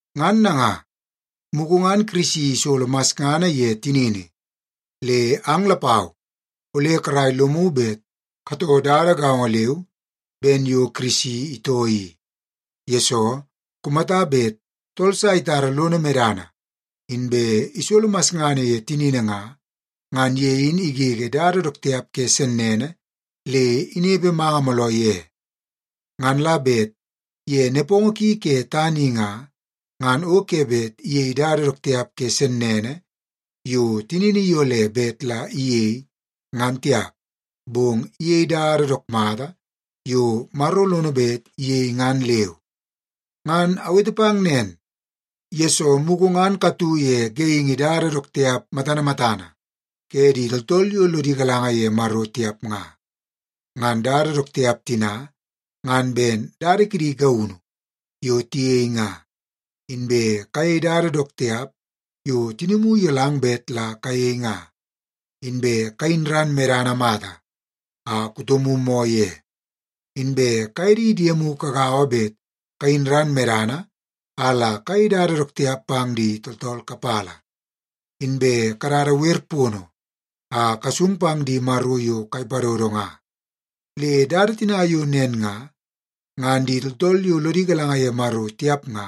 Ngan nanga, mugu ngan Kirisi isolo masngana ye tinini, le ang lapau ole karai lomu bet katoo dada gaongo leu ben yo Kirisi itoo i, yesoo kumata bet tool sa itara lono medana inbe isolo masngana ye tinini nga, ngan ye in igege dada dook tiap ke sennene le inepe manga mooloo ye. Ngan la bet ye nepongo ki ke tana i nga, ngan o ke bet iyei dada dook tiap ke sennene yo tinini iyole bet la iyei ngan tiap, bong iyei dada dook mata yo Maro lono bet iyei ngan leu. Ngan awete pang nen, yesoo mugu ngan katu ye geingi dada dook tiap matana matana ke di tooltool yo lodi galanga ye Maro tiap nga. Ngan dada dook tiap tina, ngan ben dada kidi gaunu yo tiyei nga, inbe kayei dada dook tiap yo tinimu iyolang bet la kayei nga, inbe kayin ran medana mata a kutomu moo ye, inbe kaye di diemu kagaua bet kayin ran medana a la kayei dada dook tiap pang di tooltool kapala, inbe kadada wer pono a kasung pang di maro yo kai padodo nga. Le dada tina yo nen nga, ngan di tooltool yo lodi galanga ye Maro tiap nga,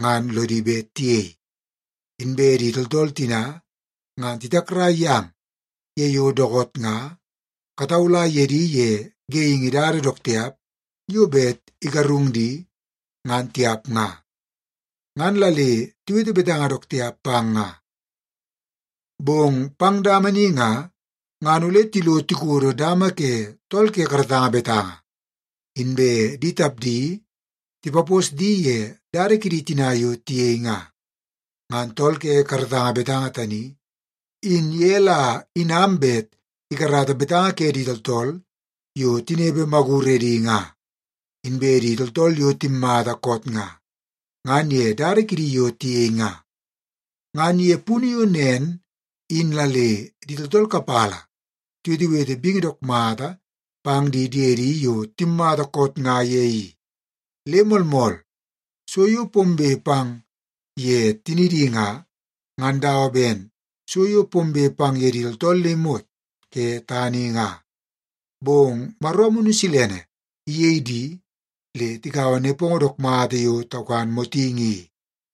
ngan lodi bet tiyei. Inbe di tooltool tina, ngan titakrai yang ye yo dookoot nga kataula ye di ye geingi dada dook tiap yo bet igarung di, ngan tiap nga. Ngan la le tiwete betanga dook tiap pang nga. Bong pang dama ni nga, ngan ole tilo tikodo dama ke tool ke karatanga betanga, inbe di tapdi tipapos di ye dada kidi tina yo tiyei nga. Ngan tool ke karatanga betanga tani, in ye la inam bet ikarata betanga ke di tooltool yo tinepe maguredi nga, inbe di tooltool yo timmata koot nga, ngan ye dada kidi yo tiyei nga. Ngan ye punu yo nen in la le di tooltool kapala tiwetewete bingi dook mata pang di diedi yo timmata koot nga ye i. Le moolmool, so yo pombe pang ye tinidi nga, ngan dawa ben so yo pombe pang ye di tooltool le imot ke tana i nga, bong Maro Amunu Silene iyei di le tikaua nepongo dook mata yo taukan motingi i.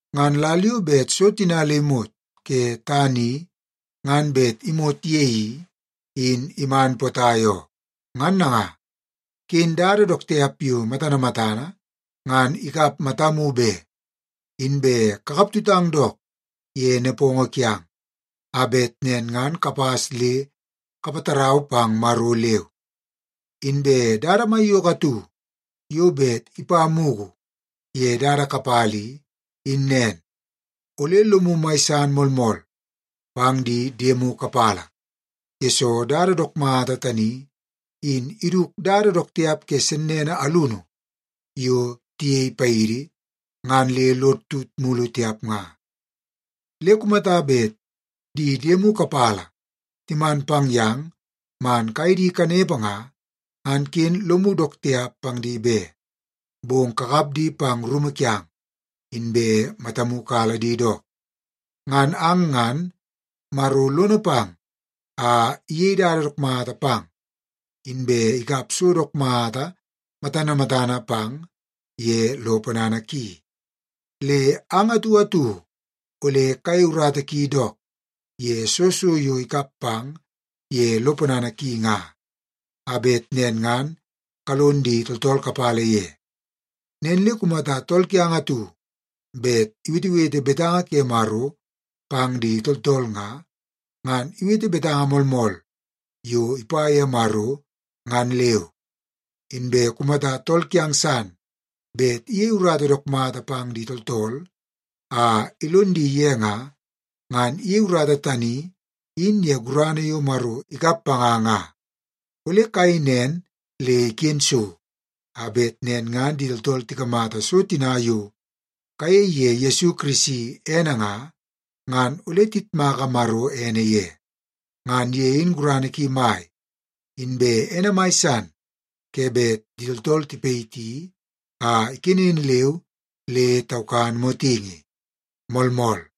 Ngan lal yo bet so tina le imot ke tana i ngan bet imot ye i, in iman potai oo. Ngan nanga, ken dada dook tiap yo matana matana ngan ikap matamu be, inbe kakaptutang dook ye nepongo kiang, a bet nen ngan kapas le kapatarau pang Maro leu. Inbe dada maiyoko atu yo bet ipa mugu ye dada kapala i, in nen. Ole lomu mai san moolmool pang di diemu kapala, yesoo dada dook mata tani, in iduk dada dook tiap ke sennene alunu yo tiyei paidi, ngan le lod tut mulu tiap nga. Le kumata bet di diemu kapala timan pang yang man kaye di kanepe nga, ngan ken lomu dook tiap pang di be, bong kakap di pang rumu kiang, inbe matamu kala di dook. Ngan ang ngan, Maro lono pang a iyei dada dook mata pang, inbe ikap so dook mata matana matana pang ye lo ponana ki. Le ang atu atu ole kayei urata ki dook ye soo so yo ikap pang ye lo ponana ki nga, a bet nen ngan kalon di tooltool kapala ye. Nen le kumata tool kiang atu bet iwetewete betanga ke Maro pang di tooltool nga, ngan iwete betanga moolmool yo ipa ye Maro ngan leu. Inbe kumata tool kiang san bet iyei urata dook mata pang di tooltool a ilon di ye nga, ngan iyei urata tani in ye gurana yo Maro ikap panga nga. Ole kayei nen le iken so, a bet nen ngan di tooltool tikamata so tina yo kayei ye Yesu Kirisi ene nga, ngan ole tiyitmaka Maro ene ye. Ngan ye in gurana ki mai, inbe ene mai san ke bet di tooltool tipayiti a ikenen leu le taukan motingi. Moolmool.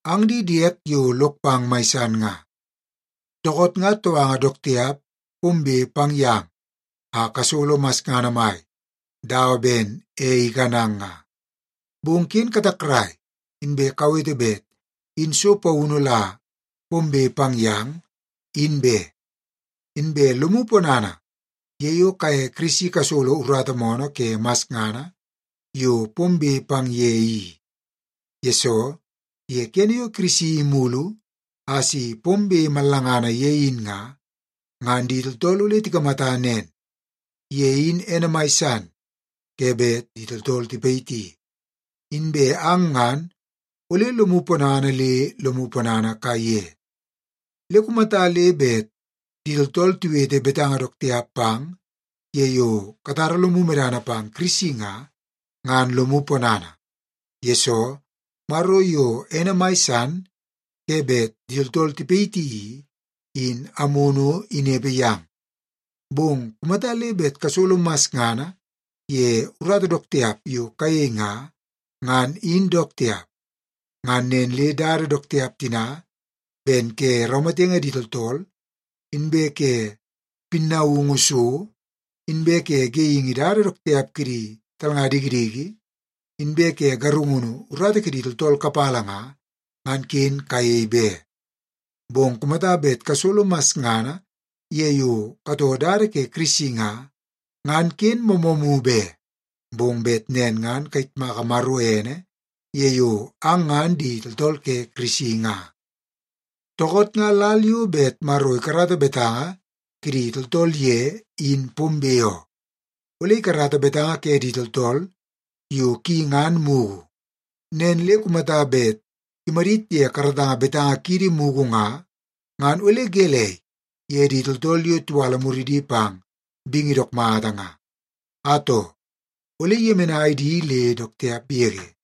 Ang di diek yo lok pang mai san nga, dookoot nga touanga dook tiap pombe pang yang a kasolo masngana mai dawa ben ei ikanang nga. Bong ken katakrai inbe kawete bet in so paunu la pombe pang yang, in be. Inbe lomu ponana ye yo kaye Kirisi kasolo urata moonoo ke masngana yo pombe pang ye i. Yesoo, ye kene yo Kirisi imulu a si pombe mallangana ye in nga, ngan di tooltool ole tikamata nen, ye in ene mai san ke bet di tooltool tipayiti, inbe ang ngan ole lomu ponana le lomu ponana kaiye. Le kumata le bet di tooltool tiwete betanga dook tiap pang ye yo katara lomu medana pang Kirisi nga, ngan lomu ponana, yesoo Maro yo ene mai san ke bet di tooltool tipayiti i, in Amunu inepe yang. Bong kumata le bet kasolo masngana ye urata dook tiap yo kayei nga, ngan in dook tiap. Ngan nen le dada dook tiap tina ben ke raumatenge di tooltool, inbe ke pinaungu so, inbe ke geingi dada dook tiap kidi talnga dikidiki, inbe ke garungunu urata kidi tooltool kapala nga, ngan ken kayei be. Bong kumata bet kasolo masngana ye yo katoo dada ke Kirisi nga, ngan ken moomoomu be. Bong bet nen ngan kayitmaka Maro ene ye yo ang ngan di tooltool ke Kirisi nga. Dookoot nga lal yo bet Maro ikarata betanga kidi tooltool ye in pombe oo. Ole ikarata betanga ke di tooltool yo ki ngan mugu. Nen le kumata bet imadit ye karatanga betanga kiidi mugu nga, ngan ole gelei ye di tooltool yo tiwala muridi pang bingi dook mata nga? Atoo, ole iyemenai di le dook tiap yege.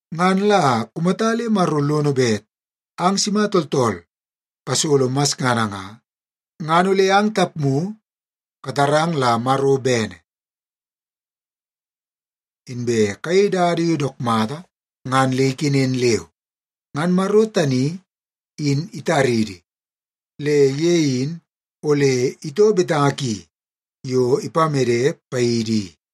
Ngan la kumata le Maro lono bet ang sima tooltool kasolo masngana nga, ngan ole ang tapmu katarang la Maro bene, inbe kayei dada yo dook mata ngan le ikenen leu. Ngan Maro tani in itaridi, le ye in ole itoo betanga ki yo ipamede paidi i.